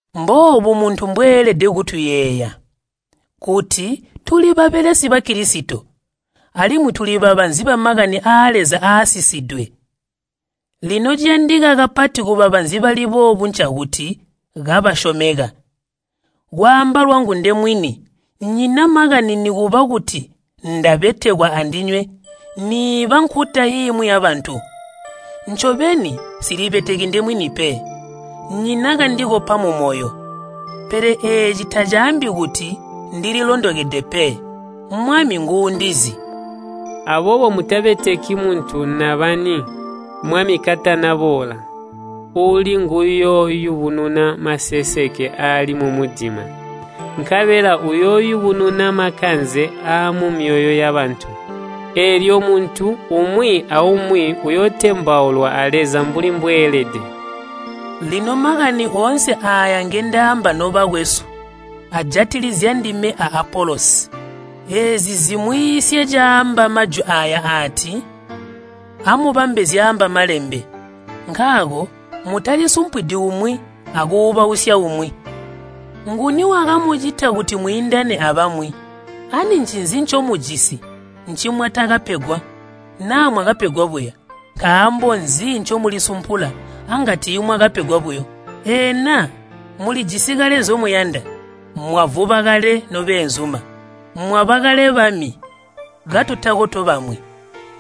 Mboobu muntu mbweelede kutuyeeya, kuti tuli babelesi ba Kilisito, alimwi tuli babanzi bamakani aa Leza aasisidwe. Lino ciyandika kapati kubabanzi bali boobu ncakuti kabasyomeka. Kwaamba lwangu ndewini nnyina makani nikuba kuti ndabetekwa andinywe niiba nkuta imwi yabantu. Ncobeni nsilibeteki ndemwini pe. Nnyina kandikopa mumoyo, pele eeci tacaambi kuti ndilondokede pe. Mwami nguundizi. Aboobo mutabeteki muntu nabani, Mwami katana boola. Uuli nguyooyubununa maseseke aali mumudima, nkabela uyooyubununa makanze aamumyoyo yabantu. Eelyo muntu umwi aumwi uyootembaulwa a Leza mbuli mbweelede. Lino makani oonse aaya ngindaamba nobakwesu, ajatilizya ndime a Apolosi. Eezi zimwiisye caamba majwi aaya aati, “Amubambe zyaamba Malembe.” Nkaako mutalisumpwidi umwi akuubausya umwi. Nguni wakamucita kuti mwiindane abamwi? Ani ncinzi ncomujisi ncimwatakapegwa? Naa mwakapegwa buya, nkaambo nzi ncomulisumpula anga tiimwakapegwa buyo? Eena mulijisi kale nzyomuyanda? Mwavuba kale nobeenzuma! Mwaba kale bami katutako tobamwi!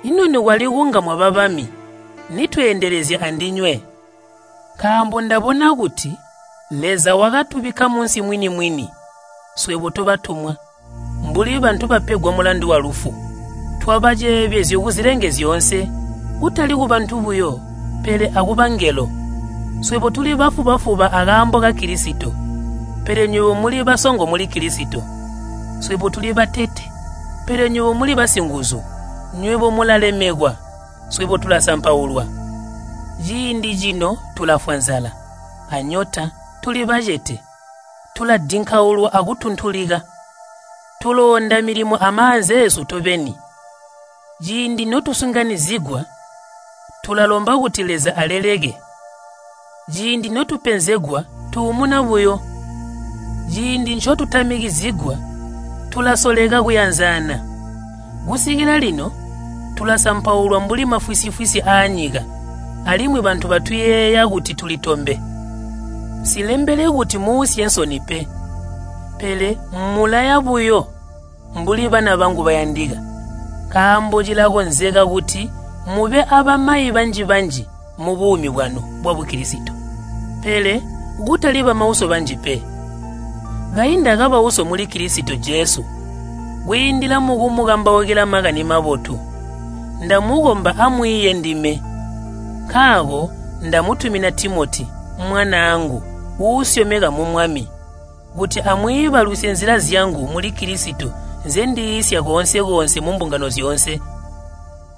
Ino nikwali kunga mwaba bami, nitweendelezya andinywe! Nkaambo ndabona kuti Leza wakatubikka munsi mwini-mwini swebo tobatumwa, mbuli bantu bapegwa mulandu walufu. Twaba ceebezyo kuzilenge zyoonse, kutali kubantu buyo pele akubangelo. Swebo tuli bafuba-fuba akaambo ka Kilisito, pele nywebo muli basongo muli Kilisito. Swebo tuli batete, pele nywebo muli basinguzu. Nywebo mulalemekwa, swebo tulasampaulwa. Ciindi cino tulafwa nzala, anyota, tuli bacete. Tuladinkaulwa akutuntulika. Tuloonda milimo amaanza eesu tobeni. Ciindi notusinganyizigwa tulalomba kuti Leza aleleke. Ciindi notupenzegwa tuumuna buyo, ciindi ncotutamikizigwa tulasoleka kuyanzana. Kusikila lino tulasampaulwa mbuli mafwisi-fwisi aanyika alimwi bantu batuyeeya kuti tuli tombe. Nsilembeli kuti muusye nsoni pe, pele mmulaya buyo mbuli bana bangu bayandika. Nkaambo cilakonzeka kuti mube abamayi banji-banji mubuumi bwanu bwa Bukilisito, pele kutali bamauso banji pe. Kayi ndakaba uso muli Kilisito Jesu kwiindila mukumukambaukila Makani Mabotu. Ndamukomba amwiiye ndime. Nkaako ndamutumina Timoti, mwanaangu uusyomeka mu Mwami, kuti amwiibalusye nzila zyangu muli Kilisito nzendiiisya koonse-koonse mumbungano zyoonse.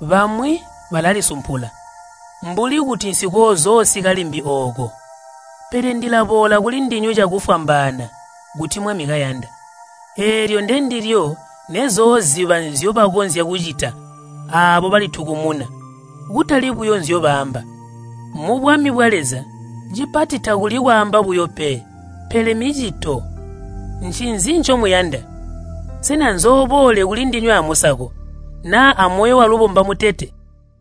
Bamwi balalisumpula, mbuli kuti nsikoozoosika limbi ooko. Pele ndilaboola kulindinywe cakufwambaana kuti Mwami kayanda, eelyo ndendilyo nezooziba nzyobakonzya kucita aabo balitukumuna, kutali buyo nzyobaamba. Mubwami bwa Leza cipati takuli kwaamba buyo pe, pele micito. Ncinzi ncomuyanda? Sena nzooboole kulindinywe amusako, naa amoyo walubomba mutete?